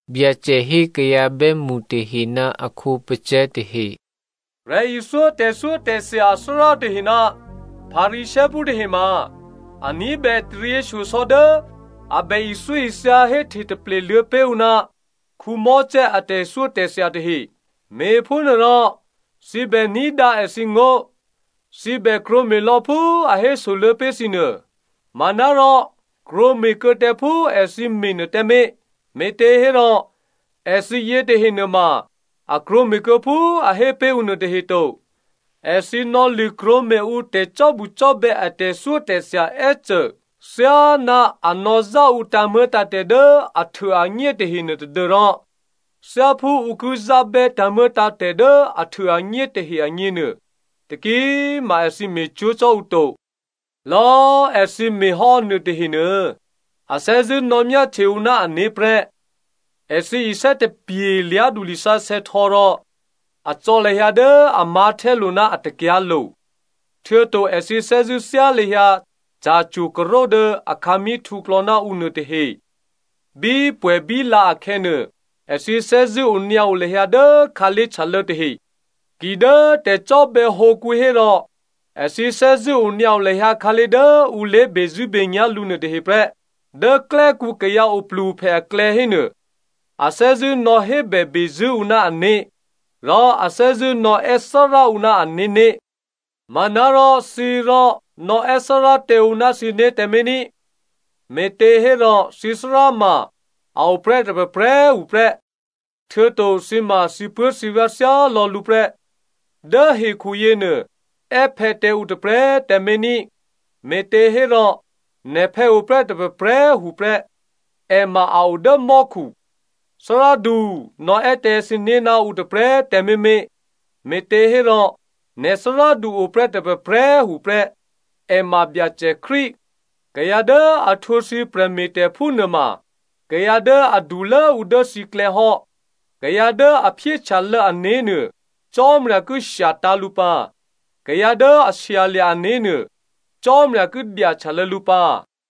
Byacè hé kayǎ bè́mṳ tahe ná a khǒpacè̤̌ tahe, “Prè̤ithyó tè̤thyótè̤thya athárá tahe ná Pharisěophú tahe ma a ní̤bè taryěshyosò̌ dố a bè ithyóithya héhte taple luô̌ pé̤ ǔ ná Mosè a tè̤thyótè̤thya tahe. Me̤phúnuôrò thǐ bè ní̤dǎ èthǐngó̤, thǐ bè krwǒme̤ lò̌ phú a hésoluô̌ pé̤ thǐ nuô. Manárò krwǒme̤ kuô̌ tǎ phú èthǐ me̤nuô tǎmé̤, me̤těhérò èthǐ yětahe nuôma a krwǒme̤ kuô̌ phú a hé pé̤ ǔ nuôtahe to. Èthǐ nò̌lṳ̂krwǒme̤ ǔ tè̤cò́bucò́bè̌ a tè̤thyótè̤thya è́cô thyáná a nò̌zá ǔ tǎ̤muô̌tǎ̤tè̤ dố ahtuôanyé tahenuô tadû́rò thyáphú ǔ ki zábè́ tǎ̤muô̌tǎ̤tè̤ dố ahtuôanyé tahe agněnuô, taki꤮ ma èthǐ me̤cwó̤ cò́ ǔ to. “Lò̌꤮ èthǐ me̤ hò́ nuôtahe nuô a thè́zṳ̂́ nò̌myáhtye ǔ ná ané̤ prè́. Èthǐ isè́ tapye̤ lyá̤du lisǎsè̌ htò̌ rò a cò̌ lahyǎ dố a mǎ̤htè́lo̤ ná a takyǎ̤lo̤, htuô̌to èthǐ thè́zṳ̂́ thyá lahyǎ ca̤cwo̤karo̤ dố akhǎmí̤ htǔklò̌ ná ǔ nuôtahe. Bípwè̌bíla akhè̌nuô, èthǐ thè́zṳ̂́ onyǎo lahyǎ dố khǎlé̤ htyalô̌ tahe. Kidố tè̤cò́bè̌ hǒkǔ hérò èthǐ thè́zṳ̂́ onyǎo lahyǎ khǎlé̤ dố ǔ lé̤bezṳ̂́benyá̤ lǔ nuôtahe prè́. Dố klè́kǔ kayǎ oplu-ophè aklè̌ hénuô, a thè́zṳ̂́ nò̌hébè bezṳ̂́ ǔ ná ané̤, rò a thè́zṳ̂́ nò̌è́ ‘Thárá’ ǔ ná ané̤né̤. “Manárò thǐ rò nò̌ è́ ‘Thárá’ tǎ ǔ ná thǐné̤ tǎmé̤ ní꤮, me̤těhérò thǐthárá ma a o prè́ tôprè̤prè̤꤮ tuô̌ prè́. Htuô̌to thǐ ma thǐpuố̤thǐvyá̤ thyálò̌ lǔ prè́. Dố hekhu yěnuô è́ ‘phè̌’ tǎ ǔ tôprè̤꤮ tǎmé̤ ní꤮, me̤těhérò nè̤phè̌ oprè́ tôprè̤prè̤꤮ tuô̌ prè́. È ma a o dố mò́khu. ‘Thárádu,’ nò̌ è́ tǎ thǐné̤ ná ǔ tôprè̤꤮ tǎmé̤mé̤, me̤těhérò nè̤ thárádu o prè́ tôprè̤prè̤꤮ tuô̌ prè́, è ma Byacè Krístu. Kayǎ dố a htwǒ thǐ prè̤me̤tè̤phú nuôma kayǎ dố adulốǔ dố thǐklè̌ hò́. Kayǎ dố a phyéhtyalô̌ ané̤ nuô, Cò́marya ki shyatǎ̤ lǔ pǎ. Kayǎ dố a shyalya̤ ané̤ nuô Cò́marya ki dyahtyalô̌ lǔ pǎ.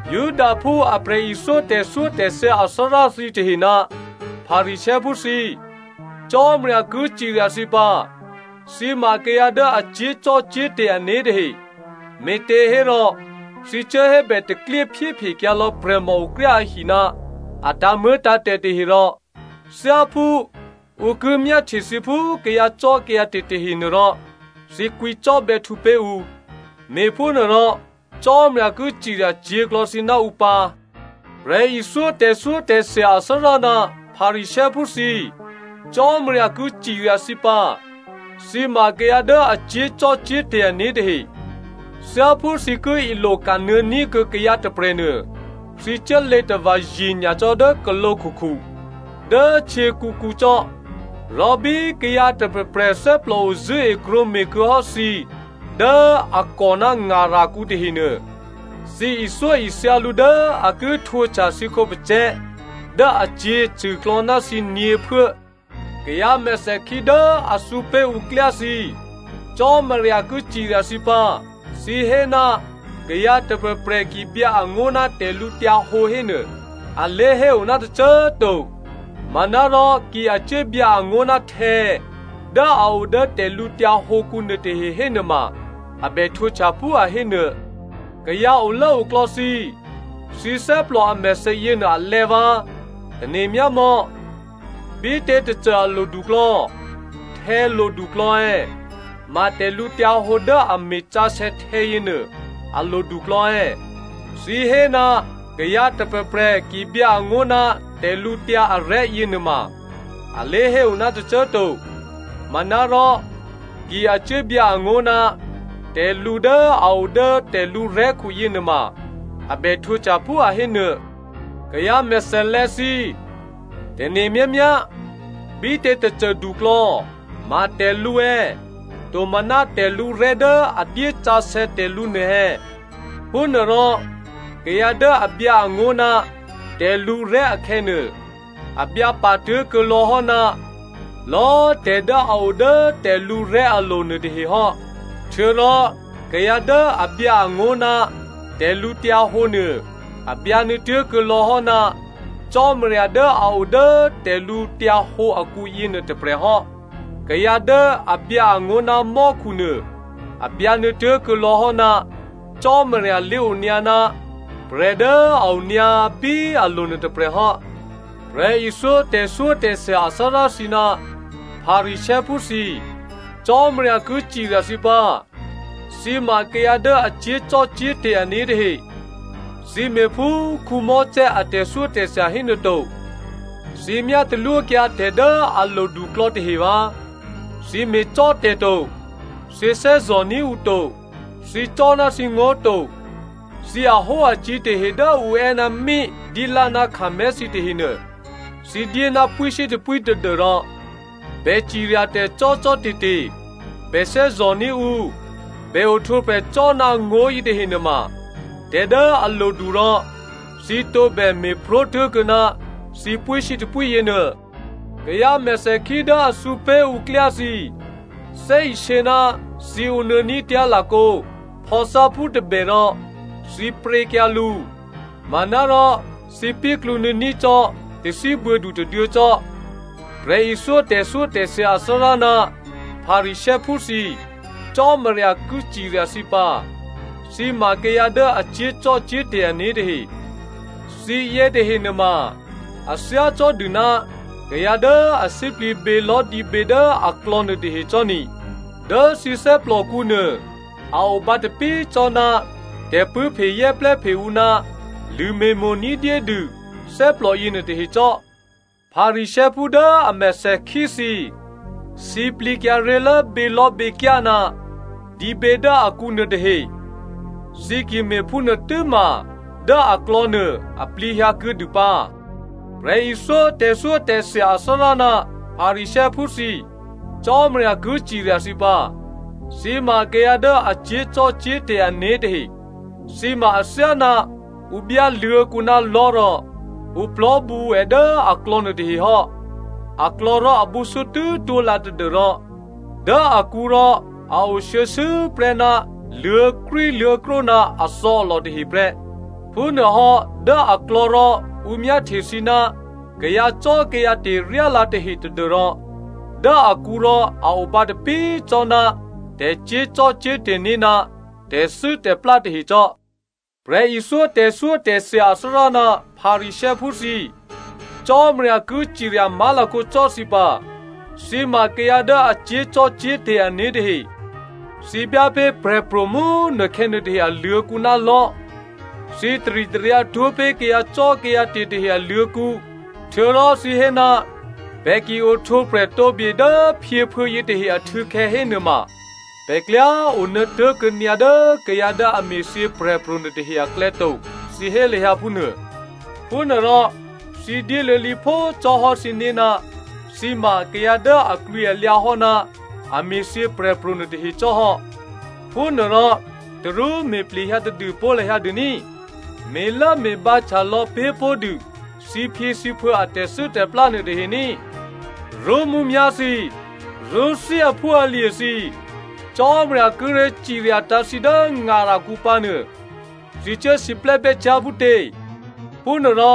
Judaphú a prè̤ithyó tè̤thyótè̤thya athárá thǐtahe ná Pharisěophú thǐ꤮ Cò́marya ki cirya thǐ pǎ. Thǐ ma kayǎ dố a cyé̤zò́cò́te̤ ané̤ tahe. Me̤těhérò thǐ cuố hébè taklyé phyéphekyǎlò̌ prè̤mòokryá ahi ná a tǎ̤muô̌tǎ̤tè̤ tahe rò thyáphú ǔ ki myáhtye thǐ phú kayǎcò́kayǎte̤ tahe nuôrò thǐ kwǐ cò́bè̌htǔ pé̤ ǔ. Me̤phúnuôrò Cò́marya ki cirya cyě̤klò̌ thǐ ná ǔ pǎ. “Prè̤ithyó tè̤thyótè̤thya athárá ná Pharisěophú thǐ꤮, Cò́marya ki cirya thǐ pǎ. Thǐ ma kayǎ dố a cyé̤zò́cò́te̤ ané̤ tahe. Thyáphú thǐ ki ilo kanuô̌ ní̤kuô̌ kayǎ tôprè̤nuô, thǐ cuốlě tava̤ ye̤nyacò́ dố khǒlǒ khukhu, dố htyěkǔkǔ cò́, rò bí kayǎ tôprè̤prè̤ thè́plòo zṳ̂́e krwǒme̤ kuô̌ hò́ thǐ dố a kò ná ngarakǔ tahenuô, thǐ ithyóithya lǔ dố a ki htwǒhtya thǐ khǒpacè̤̌ dố acyě̤acṳ̂klò̌ ná thǐ nyě̤phuố. “Kayǎ mèthèkhí dố a thǔ pé̤ ǔ klyá thǐ꤮, Cò́marya ki cirya thǐ pǎ. Thǐ hé, ‘Kayǎ tôprè̤prè̤ ki byǎangó̤ ná tè̤lǔhǒdu hénuô, a lé̤héo ná tôcô꤮ to, manárò ki a cuốbyǎ angó̤ ná htè̌ dố a o dố tè̤lǔtyǎ hǒkǔ nuôtahe hénuôma a bè htwǒhtya phú a hé nuô.’ Kayǎ olốoklò̌ thǐ꤮, thǐ thè́plò a mèthè yěnuô a lè̌ vǎ꤮. Tane̤ myámò̌, bítě tôcô a loduklò̌. Htè̌ loduklò̌ è̌? Ma tè̤lǔhǒdu dố a me̤sǎsè̌ htè̌yěnuô a loduklò̌ è̌? Thǐ hé, ‘Kayǎ tôprè̤prè̤ ki byǎ angó̤ ná tè̤lǔtyǎ arè̤́ yěnuôma, a lé̤héo ná tôcô꤮ to. Manárò ki a cuố byǎ angó̤ ná tè̤lǔ dố a o dố tè̤lǔrè̤́khu yěnuôma a bè htwǒhtya phú a hé nuô.’ Kayǎ mèthèlè̌ thǐ꤮, tane̤ myámyá, bítě tôcô duklò̌, ma tè̤lǔ è̌? Tomaná tè̤lǔrè̤́ dố a dyé sǎsè̌ tè̤lǔ nuô è̌? Phúnuôrò kayǎ dố a byǎ angó̤ ná tè̤lǔrè̤́ akhè̌nuô, a byǎpa tố̤kuô̌ lò̌ hò́ ná lò̌꤮ tè̤ dố a o dố tè̤lǔrè̤́ alo̤ nuôtahe hò́. Htuô̌rò kayǎ dố a byǎ angó̤ ná tè̤lǔhǒdu nuô, a byǎ nuô̌tố̤kuô̌ lò̌ hò́ ná Cò́marya dố a o dố tè̤lǔhǒdu akǔ yěnuô tôprè̤ hò́. Kayǎ dố a byǎ angó̤ ná mò́khu nuô, a byǎ nuô̌tố̤kuô̌ lò̌ hò́ ná Cò́marya lé̤onyǎ ná prè̤ dố a onyǎ bí alo̤nuô tôprè̤hò́. “Prè̤ithyó tè̤thyótè̤thya athárá thǐ ná Pharisěophú thǐ꤮, Cò́marya ki cirya thǐ pǎ. Thǐ ma kayǎ dố a cyé̤zò́cò́te̤ ané̤ tahe. Thǐ me̤ phú Mosè a tè̤thyótè̤thya hénuô to. Thǐ myá talwókyǎ tè̤ dố a loduklò̌ tahe vǎ꤮. Thǐ me̤cò́tè̤to, thǐ thè́zò̤ní̤ ǔ to. Thǐ cò́ ná thǐngó̤ to. Thǐ ahóacǐ̤ tahe dố ǔ è́ ná mí, dilá ná kumí thǐ tahenuô, thǐ dyé ná pwíshyétôpwí tadû́rò bè ciryatè̤ cò́cò́te̤te̤, bè thè́zò̤ní̤ ǔ, bè ohtwǒprè̤ cò́ ná ngó̤ yětahe nuôma tè̤ dố a lodu rò thǐ tǒbè me̤pró̤ tố̤kuô̌ ná thǐ pwíshyétôpwí yěnuô. Kayǎ mèthèkhí dố a thǔ pé̤ ǔ klyá thǐ꤮, thè́isě ná thǐ ǒnuô̌ ní̤tyá̤ lakǒ phò̌tháphú tôbè rò thǐ pryě̤kyǎ lǔ manárò thǐ píklǔ nuô̌ní̤ cò́ tathíbuô̌du tôduô̌ cò́. “Prè̤ithyó tè̤thyótè̤thya athárá ná Pharisěophú thǐ꤮, Cò́marya ki cirya thǐ pǎ. Thǐ ma kayǎ dố a cyé̤zò́cò́te̤ ané̤ tahe. Thǐ yětahe nuôma a thyácò́dû ná kayǎ dố a sǐplǐ bělò̤́dǐbě dố aklò̌ nuôtahe cò́ni, dố thǐ thè́plòkǔ nuô a o bǎtapí cò́ ná tè̤pṳ̂́phe zè́plè́phe ǔ ná lṳ̂me̤mo̤ ní̤dyédû thè́plò yěnuô tahe cò́. Pharisěophú dố a mèthèkhí thǐ꤮, sǐplǐkyǎ ré̤lố bělò̤́běkyá ná dǐbě dố akǔ nuôtahe. Thǐ ki me̤phúnuô tû́ma dố aklò̌nuô a plǐhyǎ kuô̌dû pǎ. “Prè̤ithyó tè̤thyótè̤thya athárá ná Pharisěophú thǐ꤮, Cò́marya ki cirya thǐ pǎ, thǐ ma kayǎ dố a cyé̤zò́cò́te̤ ané̤ tahe. Thǐ ma athyáná ǔ byá luô̤̌kǔ ná lò̤́ rò ǔ plò̤́bǔ è dố aklò̌ nuôtahe hò́. Aklò̌ rò abǔsútú twó̤lǎ tadû́rò dố akǔ rò a o shuô̌shuô̌ prè́ ná luô̤̌krwíluô̤̌krwó ná athò̌alò tahe prè́. Phúnuôhò́ dố aklò̌ rò ǔ myáhtye thǐ ná kayǎcò́kayǎte̤ ryálǎ tahe tadû́rò dố akǔ rò a o bǎtapí cò́ ná tè̤cyé̤zò́cò́te̤ né̤ ná tè̤thû́tè̤plá tahe cò́. “Prè̤ithyó tè̤thyótè̤thya athárá ná Pharisěophú thǐ꤮, Cò́marya ki cirya má̤lakǒ cò́ thǐ pǎ. Thǐ ma kayǎ dố a cyé̤zò́cò́te̤ ané̤ tahe. Thǐ byá pé̤ prè̤pro̤ mú꤮ nukhè̌ nuôtahe aluô̤̌kǔ ná lò̤́. Thǐ taritaryǎ twó̤ pé̤ kayǎcò́kayǎte̤ tahe aluô̤̌kǔ. Htuô̌rò thǐ hé, ‘Pè̤ ki ohtwǒprè̤ tǒ bye dố phyěphuô̌ yětahe ahtû̌khè̌ hénuôma, pè̤ klyá onuô̌ tố̤kuô̌ nyǎ dố kayǎ dố a me̤thyě prè̤pro̤ nuôtahe aklè̌ to,’ thǐ hé lahyǎ phúnuô. Phúnuôrò thǐ dyéluô̌ lǐphó cò́hò́ thǐné̤ ná thǐ ma kayǎ dố aklwǐalyǎ hò́ ná a me̤thyě prè̤pro̤ nuôtahe cò́hò́. Phúnuôrò tarú me̤ plehyǎ tadû pó̤ lahyǎ dû ní꤮. Me̤lốme̤bǎhtya lò̌ pé̤pó̤dû thǐphyěthǐphuô̌ a tè̤thû́tè̤plá nuôtahe ní꤮. “Rṳ́mǔmyá̤ thǐ꤮, rṳ́thí aphúalye̤ thǐ꤮, Cò́marya kíré̤ ciryatǎ̤ thǐ dố ngarakǔ pǎnuô, thǐ cuố siplè́bè́ cyá̤ phútě? Phúnuôrò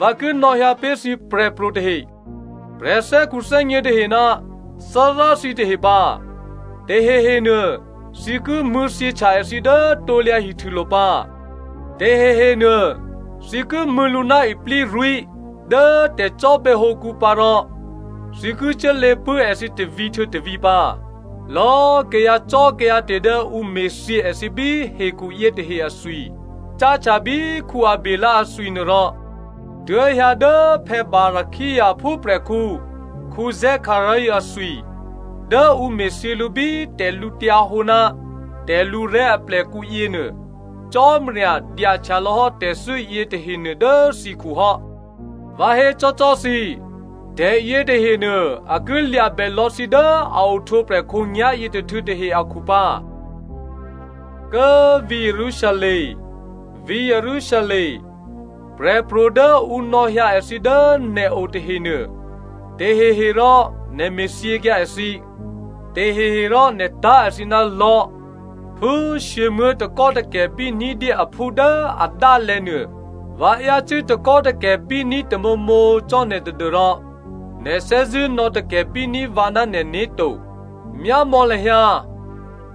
vǎ ki nò̌hyǎ pé̤ thǐ prè̤pro̤ tahe, prè̤thè́khuthè́gně tahe ná Thárá thǐtahe pǎ, tahehenuô thǐ ki mṳ̂̌thyěhtya èthǐ dố krusulo̤ pǎ, tahehenuô thǐ ki mṳ̂̌ lǔ ná iplírwí̤ dố tè̤cò́bè̌hǒkǔ pǎ rò thǐ ki cuốlě pṳ̂́ èthǐ tôvǐ̤ htuô̌ tôvǐ̤ pǎ. Lò̌꤮ kayǎcò́kayǎte̤ dố ǔ me̤thyě èthǐ bí hekhu yětahe athwi, cáhtya bí Abělè athwi nuôrò, tuố̤hyǎ dố Barakia aphúprè̤khǔ Zekaria athwi dố ǔ me̤thyě lǔ bí tè̤lǔhǒdu ná tè̤lǔrè̤́ aplèkǔ yěnuô, Cò́marya dyahtyalò̌hò́ tè̤thû́ yětahenuô dố thǐkhu hò́. Vǎ hécò́cò́ thǐ꤮, tè̤ yětahenuô a ki lya̤bè lò̌ thǐ dố a ohtwǒprè̤ khǒnyá̤ yětôhtû̌ tahe akhu pǎ. “Kố꤮ vǐ̤ Jerusalem, vǐ̤ Jerusalem꤮ prè̤pro̤ dố ǔ nò̌hyǎ èthǐ dố nè̤o tahenuô, taheherò nè̤ me̤thyěkyǎ èthǐ, taheherò nè̤ tá̤ èthǐ ná lò̤́. Phú shyěmuố̤ takò́takè̤bí ní̤dyé aphú dố adálè̤̌ nuô, vǎ yácû́ takò́takè̤bíní̤ tamǒmǒ cò́ nè̤ tadû́rò nè̤ thè́zṳ̂́ nò̌takè̤bí ní̤ vǎ ná nè̤né̤ to. Myámò̌ lahyǎ꤮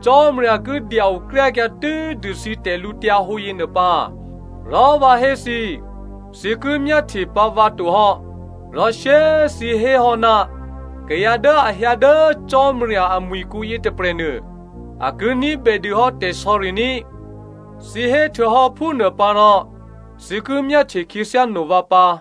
Cò́marya ki dya-okryákyǎ tû́dû thǐ tè̤lǔhǒdu yěnuô pǎ. Rò vǎ hé thǐ, thǐ ki myáhtye pǎ vǎ tohò́, rò shyé꤮ thǐ héhò́, ‘Kayǎ dố a hyǎ dố Cò́marya amwi̤kǔ yětôprè̤nuô, a ki ní̤bè dûhò́ tè̤sò̌ri ní꤮.’ Thǐ héhtuô̌hò́ phúnuô pǎ rò thǐ ki myáhtye khyěthyá no vǎ pǎ.”